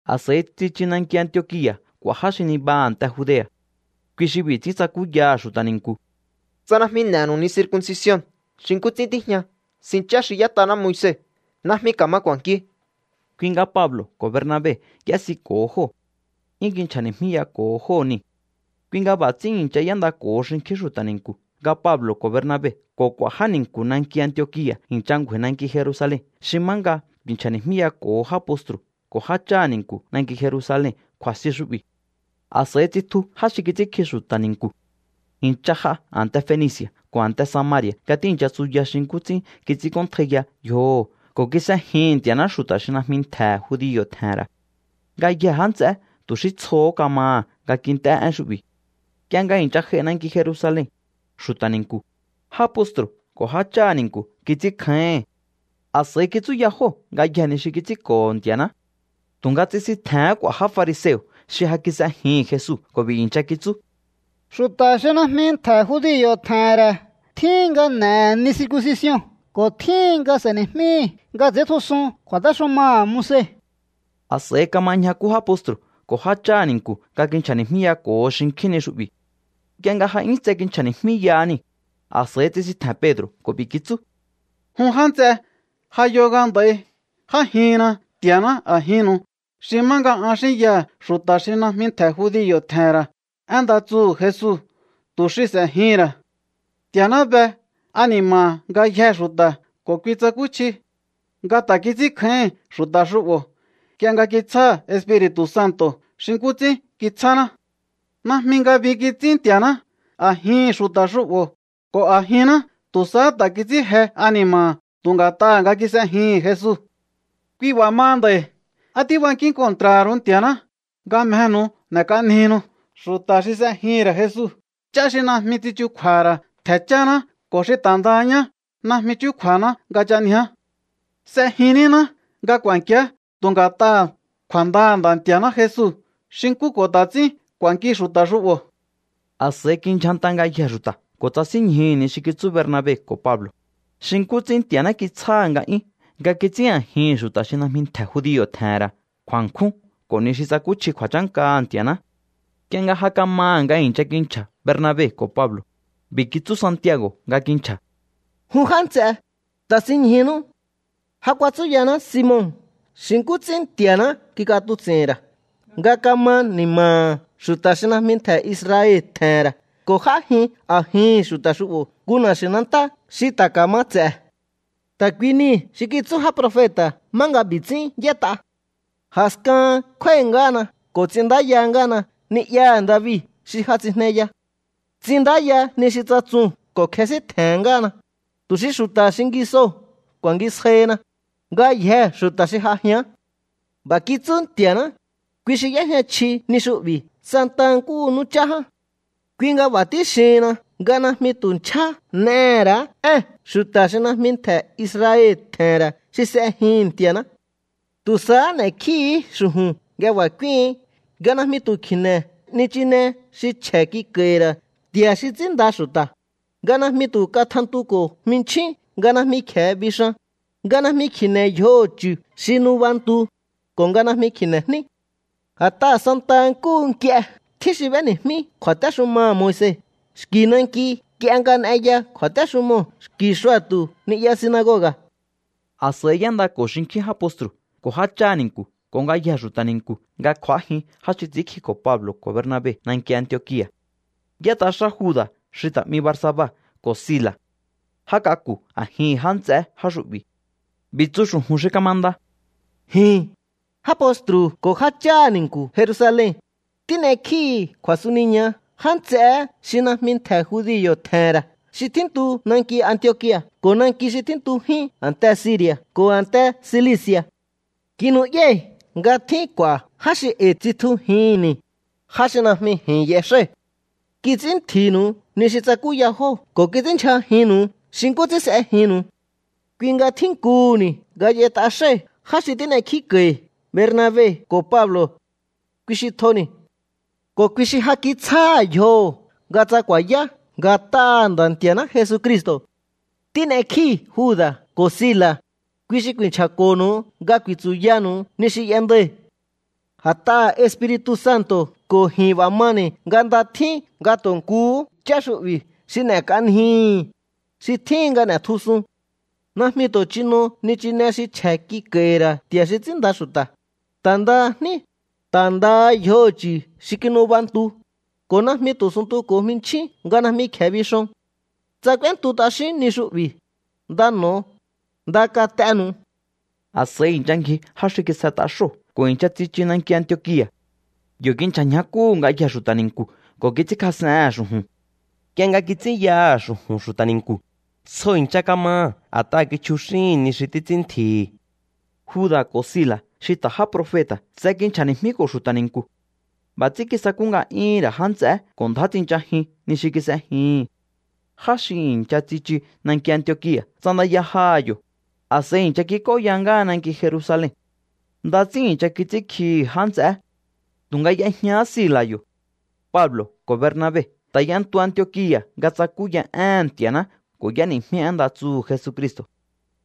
A̱s'a̱i tsichu nanki Antiokia̱ k'u̱a̱ já xi nibaha a̱nte Judea̱. Kui xi b'i̱ ts'ín tsakúyaha̱ xu̱ta̱ ni̱nku̱: —Tsa najmi n'e̱nu̱u ni circuncision xi nkú ts'ín tíjña sin chá xi y'ét'aná Moise, najmi ka̱ma k'u̱a̱nkiu. Kui nga Pablo̱ ko̱ Bernabe y'ésiko̱ho jóo̱. 'Yún kinchja̱ni̱jmíyako̱ho jóo̱ niu̱. Kui nga b'a̱ ts'ín i̱ncha y'éndako̱ho xinkjín xu̱ta̱ ni̱nku̱ nga Pablo̱ ko̱ Bernabe ko̱ k'u̱a̱ já ni̱nku̱ nanki Antiokia̱ i̱ncha ngju̱a̱i̱ nanki Jerusalen xi má nga ku̱i̱nchja̱ni̱jmíyako̱ho já postru̱ ko̱ jácháha̱ ni̱nku̱ nanki Jerusalen kju̱a̱sti xu'bi̱. A̱s'a̱i tsitju já xi kits'ínkji xu̱ta̱ ni̱nku̱. I̱ncha j'a a̱nte Fenici̱a̱ ko̱ a̱nte Samari̱a̱ nga tíi̱ncha tsuya xi nkú ts'ín kits'ínk'óntjaiya yjoho̱ ko̱ kis'ejihi̱n Nti̱a̱ná xu̱ta̱ xi najmi ntje̱ judio̱ tje̱he̱n ra̱. Ngayjee̱ já nts'eé tu̱ xí tsjohó kamaha̱ nga kint'é én xu'bi̱. Nk'ie nga i̱ncha j'ai nanki Jerusalen, xu̱ta̱ ni̱nku̱, já postru̱ ko̱ jácháha̱ ni̱nku̱ kits'ínkjáíhi̱n. A̱s'a̱i kitsúya jóo̱ ngayjee̱ ni xi kits'ínko̱ho̱ Nti̱a̱ná. Tu̱nga tsisintje̱hén k'u̱a̱ já fariseo̱ xi ja kis'ejihi̱n Jesu ko̱ b'i̱ i̱ncha kitsú: —Xu̱ta̱ xi najmi ntje̱ judio̱ tje̱he̱n ra̱ tjíhin nga n'e̱he̱ ni circuncision ko̱ tjíhin nga s'e̱ni̱jmíhi̱ nga ts'i̱íntjusun kju̱a̱téxumaha̱ Moise. A̱s'a̱i kama ñjakú já postru̱ ko̱ jácháha̱ ni̱nku̱ nga kinchja̱ni̱jmíyako̱ho xinkjín ni xu'bi̱. Nk'ie nga ja 'yún tse kinchja̱ni̱jmíyaha niu̱, a̱s'a̱i tsisintje̱n Pedro̱ ko̱ b'i̱ kitsú: —Jun já nts'e, ja yo nga nd'a̱i j'ájihinna Nti̱a̱ná a̱jinnu̱u xi má nga an xínyaha̱ xu̱ta̱ xi najmi ntje̱ judio̱ tje̱he̱n ra̱ én nda tsuhu̱ Jesu tu̱ xi s'e̱jihi̱n ra̱. Nti̱a̱ná be ani̱ma̱ha̱ ngayjee̱ xu̱ta̱ ko̱ kui tsakúchji nga ta̱ kits'ínkjáíhi̱n xu̱ta̱ xu'bo̱ nk'ie nga kitsjáha̱ Espiri̱tu̱ Santo̱ xi nkú ts'ín kitsjáná. Najmi ngabi kits'ín Nti̱a̱ná a̱jihi̱n xu̱ta̱ xu'bo̱ ko̱ a̱jinná. Tu̱ sahá ta̱ kits'ín je ani̱ma̱ha̱ tu̱ nga̱t'aha̱ nga kis'ejihi̱n Jesu. ’Kui b'a̱ maha nd'a̱i̱, ¿á tíbankín kontra̱ha̱ ru̱u Nti̱a̱ná nga mjehe̱nu̱u n'e̱k'anjihinu xu̱ta̱ xi s'ejihi̱n ra̱ Jesu ch'á xi najmi tsichukju̱a̱ha̱ ra̱ ntje̱ cháná ko̱ xi ta̱ ndaha ñá najmi chúkju̱a̱ná nga ch'anjiá? S'ejin níná nga k'u̱a̱nkiá tu̱ nga̱t'aha̱ kju̱a̱ndaha̱ Nda̱ Nti̱a̱ná Jesu xi nkú ko̱ ta̱ ts'ín k'u̱a̱nki xu̱ta̱ xu'bo̱. A̱s'a̱i kindyjanta ngayjee̱ xu̱ta̱ ko̱ tsasínñjuhu̱ ni xi kitsú Bernabe ko̱ Pablo̱, xi nkú ts'ín Nti̱a̱ná kitsjáha̱ nga'yún nga kits'ín a̱jihi̱n xu̱ta̱ xi najmi ntje̱ judio̱ tje̱he̱n ra̱ kju̱a̱nkjún ko̱ ni xi tsakúchji kju̱a̱chánkaha̱ Nti̱a̱ná. Nk'ie nga ja kamaha̱ nga i̱ncha kinchja̱ Bernabe ko̱ Pablo̱, b'i̱ kitsú Santiago̱ nga kinchja̱: —Jun já nts'e, ta̱sinñjunú. Ja kuatsúyaná Simon xi nkú ts'ín Nti̱a̱ná kik'atuts'i̱hi̱n ra̱ nga kama ni̱ma̱ha̱ xu̱ta̱ xi najmi ntje̱ Israel tje̱he̱n ra̱ ko̱ j'ájin a̱jihi̱n xu̱ta̱ xu'bo̱ nku na̱xi̱nantá xi ta̱ ka̱ma ts'e̱. Ta̱ kui nii̱ xi kitsú já profeta̱ má nga b'i̱ ts'ín y'ét'a: A̱skahan kjúái̱ ngáhana ko̱ ts'inndáya ngáhana ni'yaha̱ David xi ja tsijneya. Ts'inndáya ni xi tsatsuu̱n ko̱ kjesíntje̱n ngáhana, tu̱ xi xu̱ta̱ xingisoo̱ ku̱a̱ngisjaihina, ngayjee̱ xu̱ta̱ xi j'ajíán. B'a̱ kitsú Nti̱a̱ná, kui xi y'éjña chji ni xu'bi̱ santaha nkúhu nú chá ján. ’Kui nga b'a̱ tíxihinna nga najmi tu̱ nchjá n'ehe̱ ra̱á ée̱n xu̱ta̱ xi najmi ntje̱ Israel tje̱he̱n ra̱ xi s'ejihi̱n Nti̱a̱ná. Tu̱ sahá n'e̱kjíhi̱í xu̱ju̱n nga b'a̱ k'úíhi̱ín nga najmi tu̱ kji̱ne̱ nichine xi chje̱ kik'a̱i̱hi̱ ra̱ nti̱a̱ xi ts'ínnda xu̱ta̱, nga najmi tu̱ katjantuko̱ jminchín nga najmi kje̱e bixan, nga najmi kji̱ne̱ yjoho̱ chu̱ xi nubantu, ko̱ nga najmi kji̱ne̱ jní. A̱t'aha̱ santaha nkúhu nk'ie tjín xi b'éni̱jmí kju̱a̱téxumaha̱ Moise xki̱ nanki nk'ie nga n'eya kju̱a̱téxumoo̱ xki̱ xua̱tu̱ ni'ya sinagoga̱. A̱s'a̱i y'éndako̱ xinkjín já postru̱ ko̱ jácháha̱ ni̱nku̱ ko̱ ngayjee̱ xu̱ta̱ ni̱nku̱ nga kj'u̱ájin já xi ts'i̱ínkjiko̱ Pablo̱ ko̱ Bernabe nanki Antiokia̱. Y'ét'a xá Juda̱ xi ta̱ 'mi Barsaba ko̱ Sila̱. Já k'aku̱ a̱jihi̱n já nts'eé já xu'bi̱. B'i̱ tsu xu̱ju̱n xi kamanda: “Ji̱n, já postru̱ ko̱ jácháha̱ ni̱nku̱ Jerusalen, tín'ekjíi̱hi̱ kju̱a̱suniña já nts'eé xi najmi ntje̱ judio̱ tje̱he̱n ra̱ xi tjíntu nanki Antiokia̱ ko̱ nanki xi tjíntujín a̱nte Siri̱a̱ ko̱ a̱nte Silici̱a̱. ’Kinu'yái̱ nga tjín k'u̱a̱ já xi e̱i̱ tsitjujihi̱nni̱, já xi najmi ji̱n y'exái̱. Kits'ín ntji̱nu̱u ni xi tsakúya jóo̱ ko̱ kits'ínndyjajinnu̱u xi nkú ts'ín s'ejinnu̱u. Kui nga tjínkuhu̱ni̱ nga y'ét'a xái̱ já xi tín'ekjíko̱i̱ Bernabe ko̱ Pablo̱. Kui xi tjoni̱ ko̱ kui xi ja kitsjáha̱ yjoho̱ nga tsa ku̱a̱yá nga̱t'aha̱ Nda̱ Nti̱a̱ná Jesucristo̱. Tín'ekjíi̱ Juda̱ ko̱ Sila̱, kui xi ku̱i̱nchja̱ko̱nu̱u nga ku̱i̱tsu̱yanu̱u ni xi y'endai̱. ’A̱t'aha̱ Espiri̱tu̱ Santo̱ ko̱ ji̱n b'a̱ mani̱ nga nda tjín nga tu̱ nkuhú ch'á xu'bi̱ xi n'e̱k'anjii̱hi̱, xi tjíhin nga n'e̱tjusun. Najmi tu̱ chino nichine xi chje̱ kik'a̱i̱hi̱ ra̱ nti̱a̱ xi ts'ínnda xu̱ta̱, ta̱ ndaha jní, ta̱ ndaha yjoho̱ chu̱ xi kinubantu, ko̱ najmi tu̱ suntuko̱ jminchjín nga najmi kje̱e bixon. Tsa k'úéntu t'axíún ni xu'bi̱, nda n'o̱o. Nda kat'enu̱u.” A̱s'a̱i i̱ncha ngji já xi kis'et'a xóo̱ ko̱ i̱ncha tsichu nanki Antiokia̱. Yo̱ kinchja̱ ñjakúhu̱ ngayjee̱ xu̱ta̱ ni̱nku̱ ko̱ kits'ínkjas'ehe̱n xu̱ju̱n. Nk'ie nga kits'ínyaha̱ xu̱ju̱n xu̱ta̱ ni̱nku̱, tsjo i̱ncha kamaha̱ a̱t'aha̱ kichjuxíhi̱n ni xi títs'ín ntji̱hi̱. Juda̱ ko̱ Sila̱ xi ta̱ já profeta̱ tse kinchja̱ni̱jmíko̱ xu̱ta̱ ni̱nku̱. B'a̱ ts'ín kisakú nga'yúhu̱n ra̱ já nts'eé ko̱ ndjá tsinchajin ni xi kis'ejihi̱n. Já xi i̱ncha tsichu nanki Antiokia̱ ts'andaya jaha̱ yo̱, a̱s'a̱i i̱ncha kik'óya ngáha nanki Jerusalen. Nda ts'ín i̱ncha kits'ínkjihi̱ já nts'eé. Tu̱nga y'ejñahá Sila̱ yo̱. Pablo̱ ko̱ Bernabe ta̱ y'entu Antiokia̱ nga tsakúya éhe̱n Nti̱a̱ná ko̱ y'éni̱jmí én nda tsuhu̱ Jesucristo̱.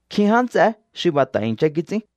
Nkjin já nts'eé xi b'a̱ ta̱ i̱ncha kits'ín.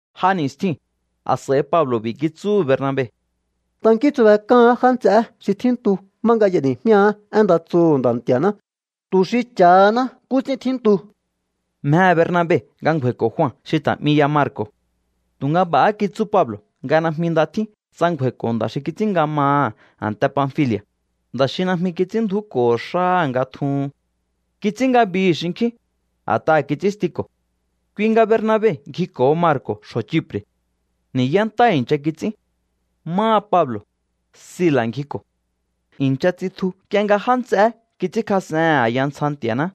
J'a ni̱stjiu̱n, a̱s'a̱i Pablo̱ b'i̱ kitsúhu̱ Bernabe: —Tankíhi̱ntsubek'áán já nts'eé xi tjíntu má nga y'eni̱jmíaá én nda tsuhu̱ Nda̱ Nti̱a̱ná tu̱ xi cha̱haná nkú ts'ín tjíntu. Mjehe̱ Bernabe nga ngju̱a̱i̱ko̱ Jua xi ta̱ 'mi ya Marco̱. Tu̱nga b'a̱há kitsú Pablo̱ nga najmi nda tjín tsa ngju̱a̱i̱ko̱ nda̱ xi kits'ín nga maha̱ a̱nte Panfili̱a̱, nda̱ xi najmi kits'ínndju̱úko̱ho̱ xáha̱ nga tjuhun. Kits'ín ngabihi̱ xinkjín, a̱t'aha̱ kits'ínstiko̱. Kui nga Bernabe ngjiko̱ho Marco̱ xjo̱ Chipre̱. Ni̱yá ntá i̱ncha kits'ín. Máha Pablo̱, Sila̱ ngjiko̱. I̱ncha tsitju nk'ie nga já nts'eé kits'ínkjas'ehe̱n a̱ya ntsja Nti̱a̱ná.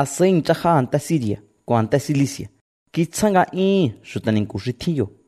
A̱s'a̱i i̱ncha j'a a̱nte Siri̱a̱ ko̱ a̱nte Cilici̱a̱. Kitsjáha̱ nga'yúhu̱n xu̱ta̱ ni̱nku̱ xi tjín yo̱.